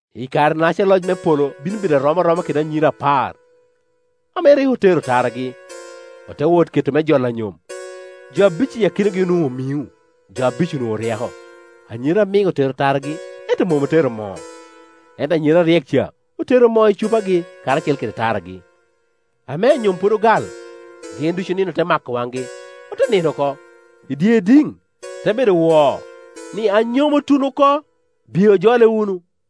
“I kare-naca loc me polo bino rom aroma kede anyira apar ame rik otero taragi, ote wot me wot jolo anyom. Jo abic i akinagi onwoŋo omiŋo, jo abic onwoŋo oryeko. Anyira amiŋ otero taragi, ento mom otero moo; ento anyira aryek ca otero moo i cupagi karacel kede taragi. Ame anyom pwod ogal, gin ducu nino te mako waŋgi, ote nino oko. I dye idiŋ te bedo woo ni, ‘Anyom otuno oko; biye ojole wunu.’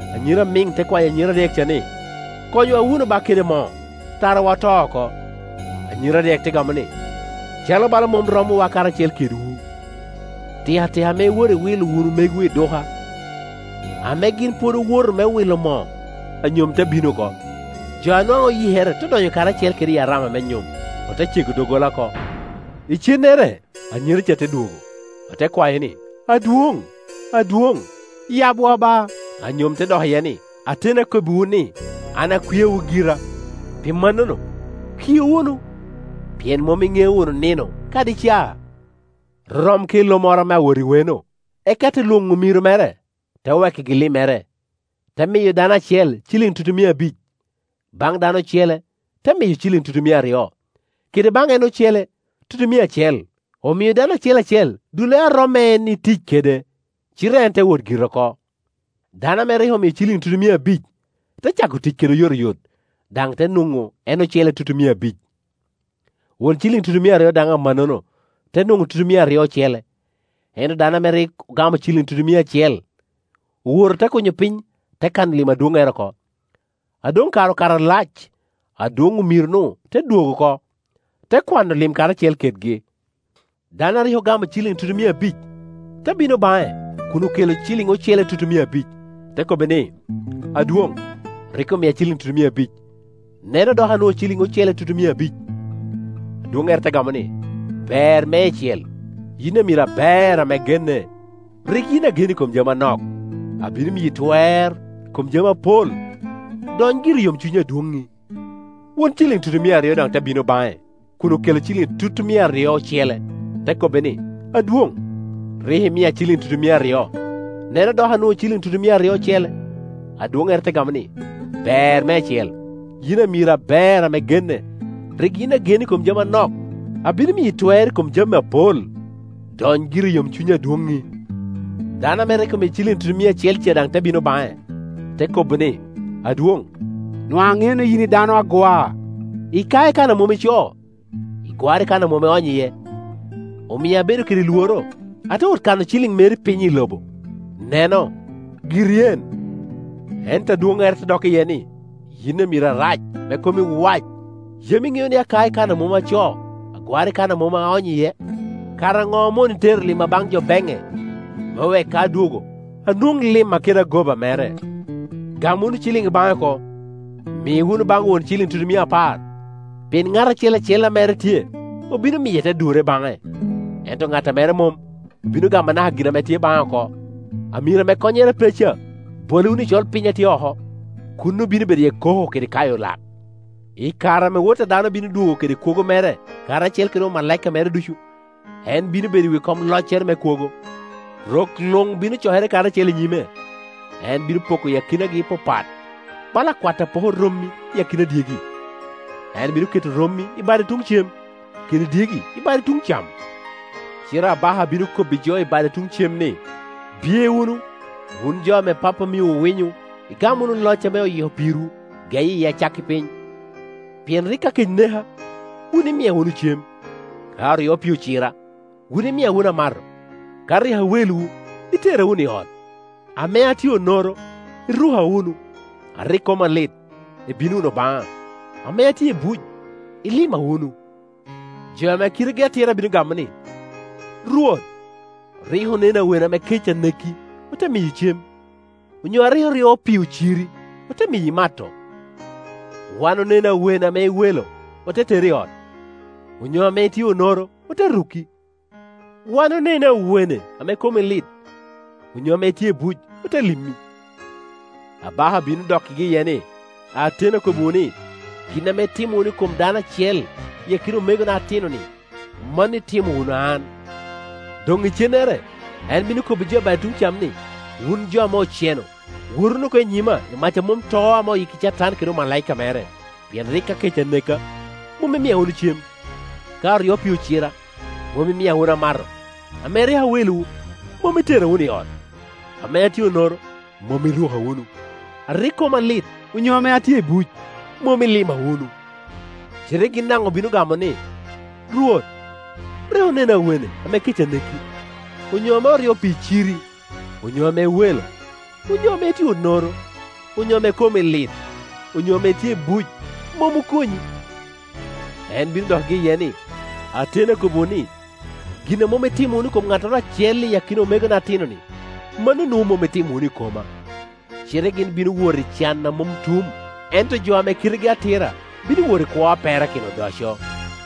Anyira amiŋ te kwayo anyira aryek ca ni, ‘Konywa wunu ba kede moo, tarawa oto oko.’ Anyira aryek te gamo ni, ‘Calo bala mom romowa karacel kedwu. Tikatika ame iwoto iwilo wunu megwu i duka.’ Ame gin pwod owoto me wilo moo, anyom te bino oko; jo a nwaŋ oyikere te donyo karacel kede i arama me nyom, ote cego doggola oko. Icennere anyira ca te dwogo, ote kwayo ni, ‘Adwoŋ, adwoŋ, yabwa ba!’ Anyom te dok iye ni, ‘Ateni akobbiwu ni, an akwiawu gira.’ Pi mannono kiu wunu, pien mom iŋeo wunu nino kadi caa. “Rorom kede lo moro ame awot weno, eka te lwoŋo omiro mere, te wekkigi limmere. Te miyo dano acel ciliŋ tutumia abic, baŋ dano acele te miyo ciliŋ tutumia aryo, kede baŋ en ocele tutumia acel; omio dano acel acel dullere a romo en itic kede, cite en te wot gire oko. Dano ame rik omio ciliŋ tutumia abic te cako tic kede oyotoyot, daŋ te nwoŋo en ocele tutumia abic. Won ciliŋ tutumia aryo daŋ amannono te nwoŋo tutumia aryo ocele. Ento dano a rik ogamo ciliŋ tutumia acel owoto te kunyo piny, te kano lim adwoŋŋere oko. A doŋ kare okato alac, adwoŋ omiro-nu te dwogo oko, te kwano lim karacel kedgi. Dano a rik ogamo ciliŋ tutumia abic te bino baŋe kun okelo ciliŋ ocele tutumia abic, te kobbe ni, ‘Adwoŋ, rik omia ciliŋ tutumia abic; neno dok anwoŋo ciliŋ ocele tutumia abic.’ Adwoŋŋere te gamo ni, ‘Ber meicel, yin amiro aber ame genne. Rik yin agen i kom jami anok, abino miyi twer i kom jami apol. Dony giri i yomcuny adwonŋi.’ Won ciliŋ tutumia aryo daŋ te bino baŋe kun okelo ciliŋ tutumia aryo ocele, te kobbe ni, ‘Adwoŋ, rik imia ciliŋ tutumia aryo; neno, dok anwoŋo ciliŋ tutumia aryo ocele.’ Adwoŋŋere te gamo ni, ‘Ber meicel, yin amiro aber ame genne. Rik yin agen i kom jami anok, abino miyi twer i kom jami apol. Dony giri i yomcuny adwonŋi.’ Dano ame rik omio ciliŋ tutumia acel daŋ te bino baŋe, te kobo ni, ‘Adwoŋ, nwaŋ aŋeo ni yin i dano agwa. Ikao i kan a mom icoo, igwaro i kan a mom ionyo iye; omia abedo kede lworo, ate wot kano ciliŋ meri piny i lobo. Neno, giri en.’ Ento adwoŋŋere te dok iye ni, ‘Yin amiro arac, ame komi wac. Yam iŋeo ni akao i kan a mom acoo, agwaro i kan a mom aonyo iye? Kara ŋo omoni tero limma baŋ jo beŋne, me wek ka adwogo, anwoŋ limma kede agoba mere? Gam wunu ciliŋ i baŋe oko, mi wunu baŋ won ciliŋ tutumia apar. Pien ŋat acel acel a mere tye obino miye, te durre baŋe; ento ŋat a mere mom obino gamo anaka gin a tye baŋe oko. Amiro ame konnyere pe ca bole wunu i colpiny a tye oko; kuno bino bedo iye koko kede kayo lak.’ “I kare ame Wot a dano bino dwogo kede kwogo mere karacel kede omalaika mere ducu, en bino bedo i wi kom loccere me kwogo. Rok luŋ bino cokere karacel i nyime, en bino poko akinagi papat, bala akwat ame poko romi i akina dyegi. En bino keto rommi i bade tuŋ cem, kede dyegi i bade tuŋ cam. Cite abaka bino kobbi jo i bade tuŋ cem ni, ‘Biye wunu, wun jo ame Pappa omiowu winyo, igam wunu loc ame oyiko pirwu geye i acakki piny. Pien rik ka kec neka, wun imia wunu cem; ka oryo pii cira, wun imia wunu amato; ka rik a welowu, itera wunu i ot; ame atye onoro, iruka wunu; a rik koma lit, ibino wunu baŋa; ame atye i buc, ilima wunu.’ Jo ame kitegi atira bino gamo ni, ‘Rwot, rik oneni awene ame kec aneki, ote miyi cem; onyo a rik oryo pii ociri, ote miyi imato? Wan oneni awene ame i welo, ote teri i ot; onyo ame itye onoro, ote ruki? Wan oneni awene ame komi lit onyo ame itye i buc, ote limi?’ Abaka bino dokkigi iye ni, ‘Ateni akobbiwu ni, gin ame itimo wunu i kom dano acel i akina omega atino-ni, mano itimo wunu an,’ Doŋ icennere en bino kobbi jo i bade tuŋ cam ni, ‘Wun jo ame oceno, wot wunu oko i nyima, i mac a mom to ame oyikki Catan kede omalaika mege. Pien rik ka kec aneka, mom imia wunu cem; ka oryo pii ocira, mom imia wunu amato; ame rik a welowu, mom itera wunu i ot; ame atye onoro, mom iruka wunu; a rik koma lit onyo ame atye i buc, mom ilima wunu.’ Cite gin daŋ obino gamo ni, ‘Rwot, rik oneni awene ame kec aneki, onyo ame oryo pii ciri, onyo ame i welo, onyo ame itye onoro, onyo ame komi lit, onyo ame itye i buc, mom okonyi?’ En bino dokkigi iye ni, ‘Ateni akobbiwu ni, Gin a mom itimo itimo wunu i kom ŋattoro acel i akina jo-ni atino-ni, mano nwoŋo mom itimo wunu i koma,’ Cite gin bino wot i can a mom tum, ento jo ame kitegi atira bino wot i kwo a perakino odoco.”